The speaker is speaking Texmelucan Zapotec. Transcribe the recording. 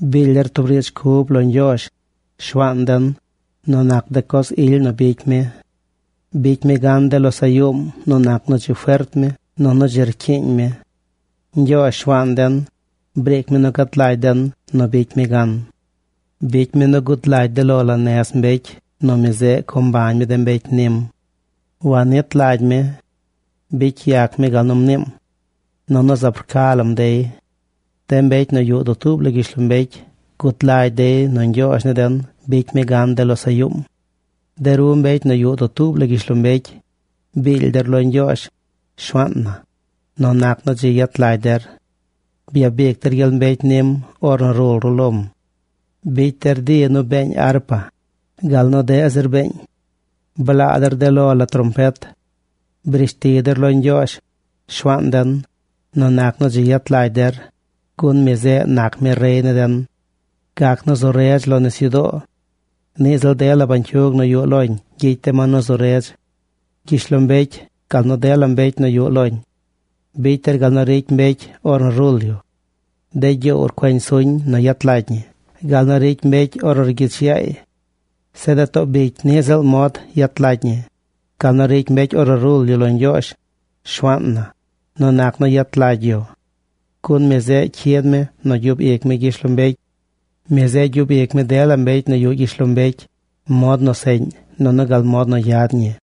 Biily der tub riidz cub lo Ñgyoozh, Shuaan den, nu nac de coz ily nu bicy mi. Bicy mi gan de losaꞌ yuum nu nac nu dzi fert mi nunu dzi rcyiiñ mi. Ñgyoozh, Shuaan den, briic mi nu gad lagy den nu bicy mi gan. Bicy mi nu gud lagy de lo la nez mbecy nu mi zeꞌ co mbañ mi de mbecy nim. Wannit lagy mi. Bicy yac mi gal nu mniim. Nunu zaab rca lam dey. De mbecy nu yuꞌ dutuub la gyishlombecy gud lagy dey nu Ñgyoozh ni den bicy mi gan de losaꞌ yuum. De ru mbecy nu yuꞌ dutuub la gyishlombecy, biily der lo Ñgyoozh, Shuaan na, nu nac nu dzi yet lagy der. Byabic der gyel mbecy nim ornu rul ru lom. Bicy der di nu beeñ arpa, gal nu deꞌ zir beeñ. Blaa der de lo la trompet. Brishti der lo Ñgyoozh, Shuaan den, nu nac nu dzi yet lagy der, gun mi zeꞌ nac mi rey ni den. Gac nu zu redz lo nisyudoo. Niꞌ ziꞌl dela de bañcyug nu yuꞌ loñ gyicy de ma nu zu redz. Gyishlombecy gal nu dela mbecy nu yuꞌ loñ bicy der gal nu ricy mbecy ornu rul yu. De gyoow rcueñ suñ nu yet lagy ñi gal nu ricy mbecy ornu rgyich yaay. Zeꞌ de too bicy niꞌ ziꞌl mod yet lagy ñi, gal nu ricy mbecy ornu rul yu lo Ñgyoozh, Shuaan na, nu nac nu yet lagy yu. Gun mi zeꞌ cyid mi nu gyub ic mi gyishlombecy. Mi zeꞌ gyub ic mi dela mbecy nu yuꞌ gyishlombecy mod nu seꞌñ nunu gal mod nu yad ñi.